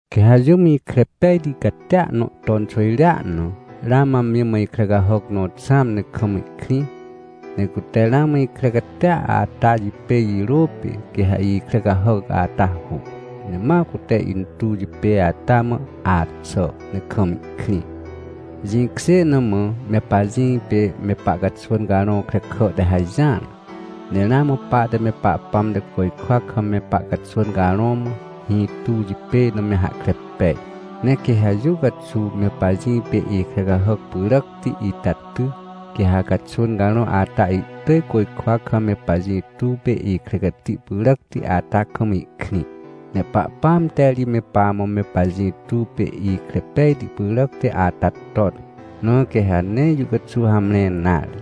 Quê ha jũm ikre pejti catia nõ ton xwỳjrea na, ramã amji mã ikre cahàc nõ xãm ne kam ihkrĩ. Ne cute ramã ikre catia ata jipêj jirô pê, quê ha ikre cahàc ata hu, ne ma cute intuw jipêj ata mã axà, ne kam ihkrĩ. Jĩkjê na mã me pajĩ pê me pahcaxwỳn carõ krekà te hajỹar. Ne ramã pahte me Pahpãm te côjkwa kam me pahcaxwỳn carõ mã, hĩ tuw jipêj na me hahkre pej. Ne quê ha jũ caxuw me pajĩ pê ikre cahàc pyràcti ita ty, quê ha caxwỳn carõ ata ihtỳj côjkwa kam me pajĩ tuw pê ikre cati pyràcti ata kam ihkrĩ. Ne Pahpãam te ri me pamã me pajĩ tuw pê ikre pejti pyràcti ata ton, na quê ha nee jũ caxuw hamre nare.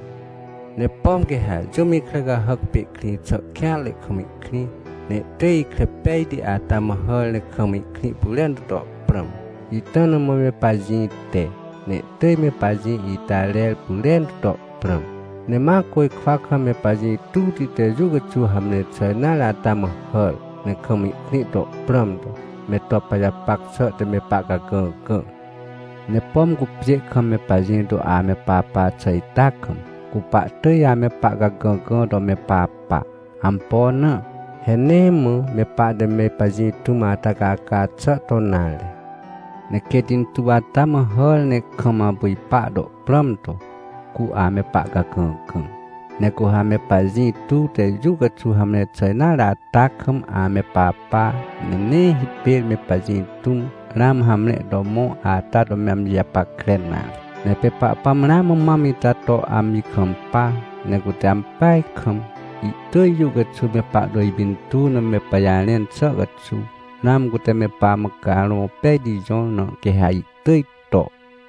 Ne pom quê ha jũm ikre cahàc pê ihkrĩ xà kêanre kam ihkrĩ, ne ihtỳj ikre pejti ata mã hàr ne kam ihkrĩ pyrentu to prãm, ita na mã me pajĩ te, ne ihtỳj me pajĩ ita rer pyrentu to prãm. Ne ma côjkwa kam me pajĩ tuwti te jũ caxuw hamre xà nare ata mã hàr, ne kam ihkrĩ to prãm to, me to pajapac xà te me pahcagãgã. Ne pom cu pjê kam me pajĩ to ame papa xà ita kam, cu pahtỳj ame pahcagãgã to me papa. Ampo na? He nee mã me pahte me pajĩ tũm ata caca xà to nare. Ne quêt intuw ata mã hàr ne kam apu ipa to prãm to, cu ame pahcagãgã. Ne cu ha me pajĩ tuw te jũ caxuw hamre xà nare ata kam ame papa, ne nee hipêr me pajĩ tũm, ramã hamre to mõ ata to me amji japackre nare. Ne pê Pahpãm ramã mam ita to amji kampa. Ne cute ampeaj kam, ihtỳj jũ caxuw me pahto ipintuw na me pajarẽn xà caxuw, ramã cute me pamã Carõ Pejti jõr, na quê ha ihtỳj to.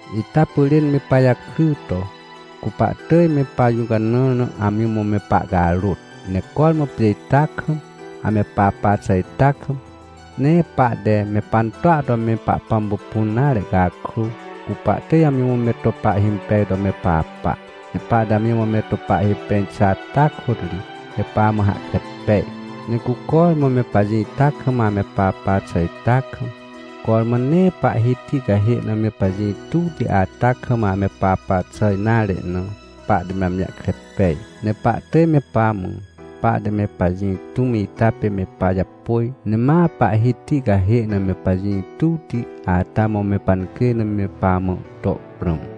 Ita pyrên me pajakry to, cu pahtỳj me pajũcanãr na amji mã me pahcarôt. Ne cormã pjê ita kam, ame papa xà ita kam, nee pahte me pantoa to me Pahpãm pupun nare cakrô, cu pahtỳj amji mã me to pahhimpej to me papa. Ne pahte amji mã me to pahhimpej xà ata kôt ri, me pamã hahkre pej. Ne cu cormã me pajĩ ita kam ame papa xà ita kam, cormã nee Pahhiti cahê na me pajĩ tuwti ata kam ame papa xà nare na, pahte me amji jahkre pej. Ne pahtỳj me pamã, pahte me pajĩ tũm ita pê me pajapôj, ne ma Pahhiti cahê na me pajĩ tuwti ata mã me pancjêj na me pamã to prãm.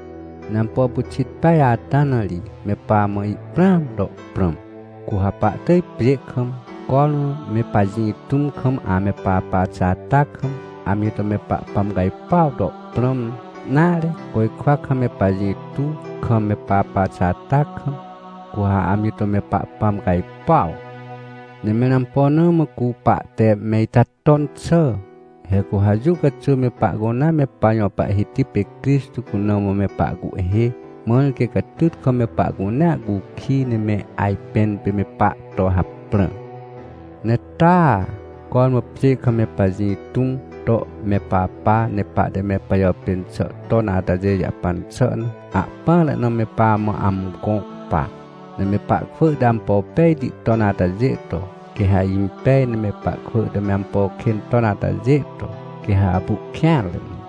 Ne ampo pyxit peaj ata na ri me pamã ihprãam to prãm. Cu ha pahtỳj pjê kam, cormã me pajĩ tũm kam ame papa xà ata kam, amji to me Pahpãm cajpuaw to prãm, nare, côjkwa kam me pajĩ tuw kam me papa xà ata kam, cu ha amji to me Pahpãm cajpuaw. Ne mẽr ampo na mã cu pahte me ita ton xà? He cu ha jũ caxuw me pahcunea me pajõ Pahhiti pê Crixtô cuna mã me pahcuhhê, mãr quê catyt kam me pahcunea cukij, ne me ajpẽn pê me pahto haprã. Ne taa, cormã pjê kam me pajĩ tũm to me papa, ne pahte me pajàpên xà ton atajê jahpan xà na, ahpỹanre na me pamã amgõ pa. Ne me pahkwỳ te ampo pejti ton atajê to, quê ha impej, ne me pahkwỳ te me ampo kên ton atajê to, quê ha apu ihkêanre ne.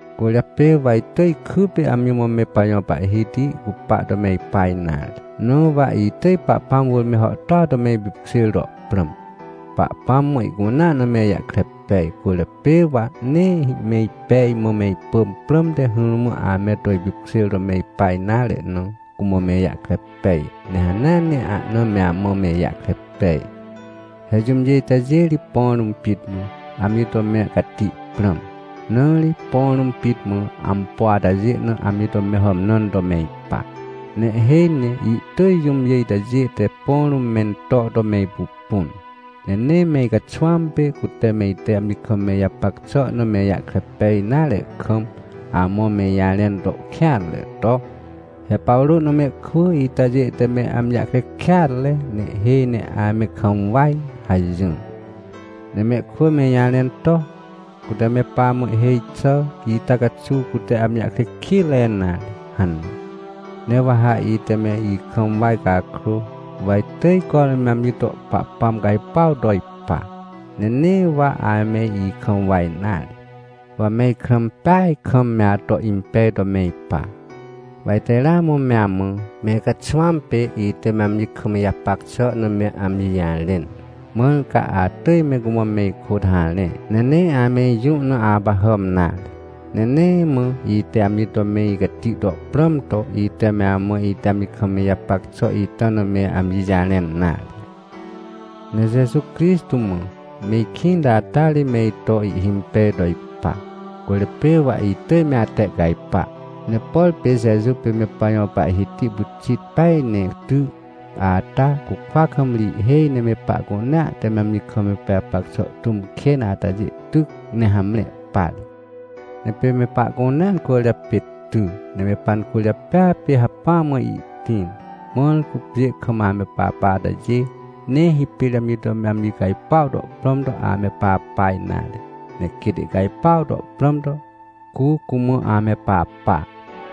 Cwỳrjapê wa itỳj kypê amji mã me pajõ Pahhiti cupa to me ipa nare. Na wa itỳj Pahpãm wỳr me hàhtôa to me ipipkjêr to prãm. Pahpãm mã ihcunea na me ijahkre pej, cwỳrjapê wa nee me ipej mã me ipỳm prãmte, hỹrmã ame to ipipkjêr to me ipa nare na, cumã me ijahkre pej, ne hanea ne ahna me amã me ijahkre pej. He jũmjê itajê ri põ rũm pit mã amji to me cati prãm, na ri põ rũm pit mã ampo atajê na amji to me hàmnãn to me ipa. Ne ihhêj ne ihtỳj jũmjê itajê te põ rũm mento to me ipupun, ne nee me icaxwãm pê, cute me ite amji kam me ijapac xà na me ijahkre pej nare kam, amã me ijarẽn to kêanre to: — He Pawrô na mehkwỳ itajê te me amji jahkre kêatre, ne ihhêj ne ame kam waj — hajỹr. Ne mehkwỳ me ijarẽn to: — Cute me pamã ihhêj xi xà ita caxuw, cute amji jahkre kitre nare — hane. Ne wa ha ite me ikam waj cakrô, wa itỳj cormã me amji to Pahpãm cajpuaw to ipa. Ne nee wa ame ikam waj nare, wa me ikrã impeaj kam me ato impej to me ipa. Wa ite ramã me amã, me icaxwãm pê ite me amji kam ijapac xà na me amji jarẽn. Mãr ca atỳj me cumã me ikôt harẽ, ne nee ame ijũ na apahàm nare. Ne nee mã ite amji to me icati to prãm to, ite me amã ite amji kam me ijapac xà ita na me amji jarẽn nare. Ne Jeju Crixtô mã me ikĩnti ata ri me ito ihhimpej to ipa, cwỳrjapê wa itỳj me atehcajpa. Ne por pê Jeju pê me pajõ Pahhiti pyxit peaj ne ty, ata cukwa kam ri ihhêj ne me pahcunea te amji kam pajapac xà tũm kên atajê tyc, ne hamre par. Ne pê me pahcunea cwỳrjapê ty, ne me pancwỳrjapêa pê hacpỹa mã ihtĩr, mãr cu pjê kam ame papa atajê, nee hipêr amji to me amji cajpuaw to prãm to ame papa nare. Ne quêt ihcajpuaw to prãm to, cu cumã ame papa.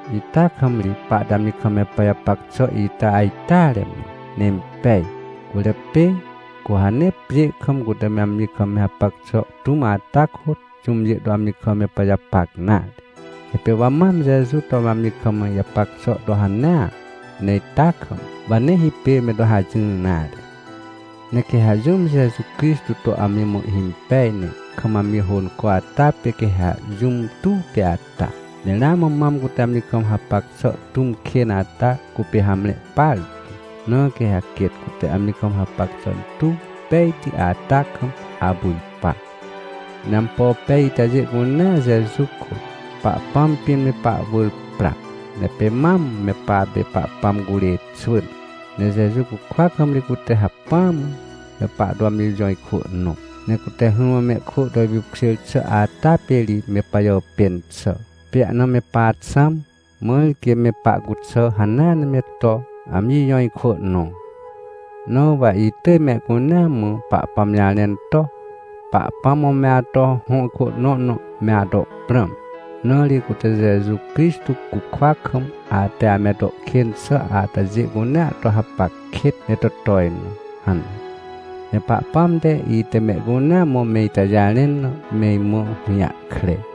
Ita kam ri pahte amji kam me pajapac xà ita ajteare mã, ne impej. Cwỳrjapê, cu ha nee pjê kam, cute me amji kam hapac xà tũm ata kôt, jũmjê to amji kam me pajapac nare. He pê wa mam Jeju to me amji kam ijapac xà to hanea. Ne ita kam, wa nee hipêr me to hajỹr nare. Ne quê ha jũm Jeju Crixtô to amji mã ihhimpej, ne kam amji hônco ata pê quê ha jũm tuwti ata. Ne ramã mam cute amji kam hapac xà tũm kên ata cupê hamre partu. Na quê ha quêt cute amji kam hapac xà tuw pejti ata kam apu ipa. Ne ampo pej itajê cunea Jeju kôt, Pahpãm pĩn, me pahwỳr pra. Ne pê mam me papê Pahpãm curê xwỳn. Ne Jeju cukwa kam ri cute hacpỹa mã, me pahto amji jõ ikwỳ nõ. Ne cute hỹrmã mehkwỳ to ipipkjêr xà ata pê ri me pajàpên xà, pê ahna me paxãm, mãr quê me pahcuxà hanea ne me to amji jõ ikwỳ nõ. Na wa itỳj mehcunea mã Pahpãm jarẽn to: — Pahpãm mã me ato hõ ikwỳ nõ na me ato prãm. Na ri cute Jeju Crixtô cukwa kam, ate ame to kên xà atajê cunea to hapac kêt, ne to tojnõ — hane. Ne Pahpãm te, ite mehcunea mã me ita jarẽn na, me imã hũjahkre.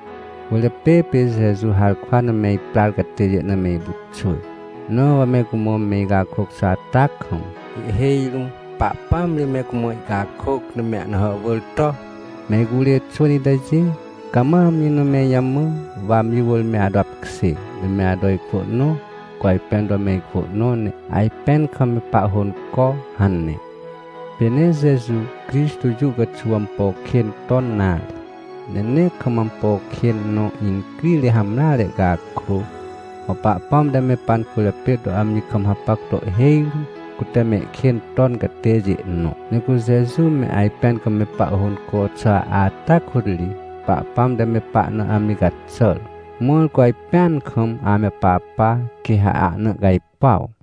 Cwỳrjapê pê Jeju harkwa na me iprar catêjê na me ipyxwỳ. Na wa me cumã me icakôc xà ata kam, ihhêj rũm Pahpãam ri me cumã ihcakôc, ne me ahna hàhwỳr to: — Me icurê xwỳn itajê, cama amji na me ijamã, wa amji wỳr me ato apkjê, ne me ato ikwỳ nõ, cu ajpẽn to me ikwỳ nõ, ne ajpẽn kam me pahhônco — hane. Pê nee Jeju Crixtô jũ caxuw ampo kên ton nare. Ne nee kam ampo kên nõ incrire hamreare cakrô, mã Pahpãm te me pancwỳrjapê to amji kam hapac to ihhêj rũm, cute mehkên ton catêjê nõ. Ne cu Jeju me ajpẽn kam me pahhônco xà ata kôt ri, Pahpãm te me pahna amji caxàr, mãr cu ajpẽan kam ame papa, quê ha ahna ihcajpuaw.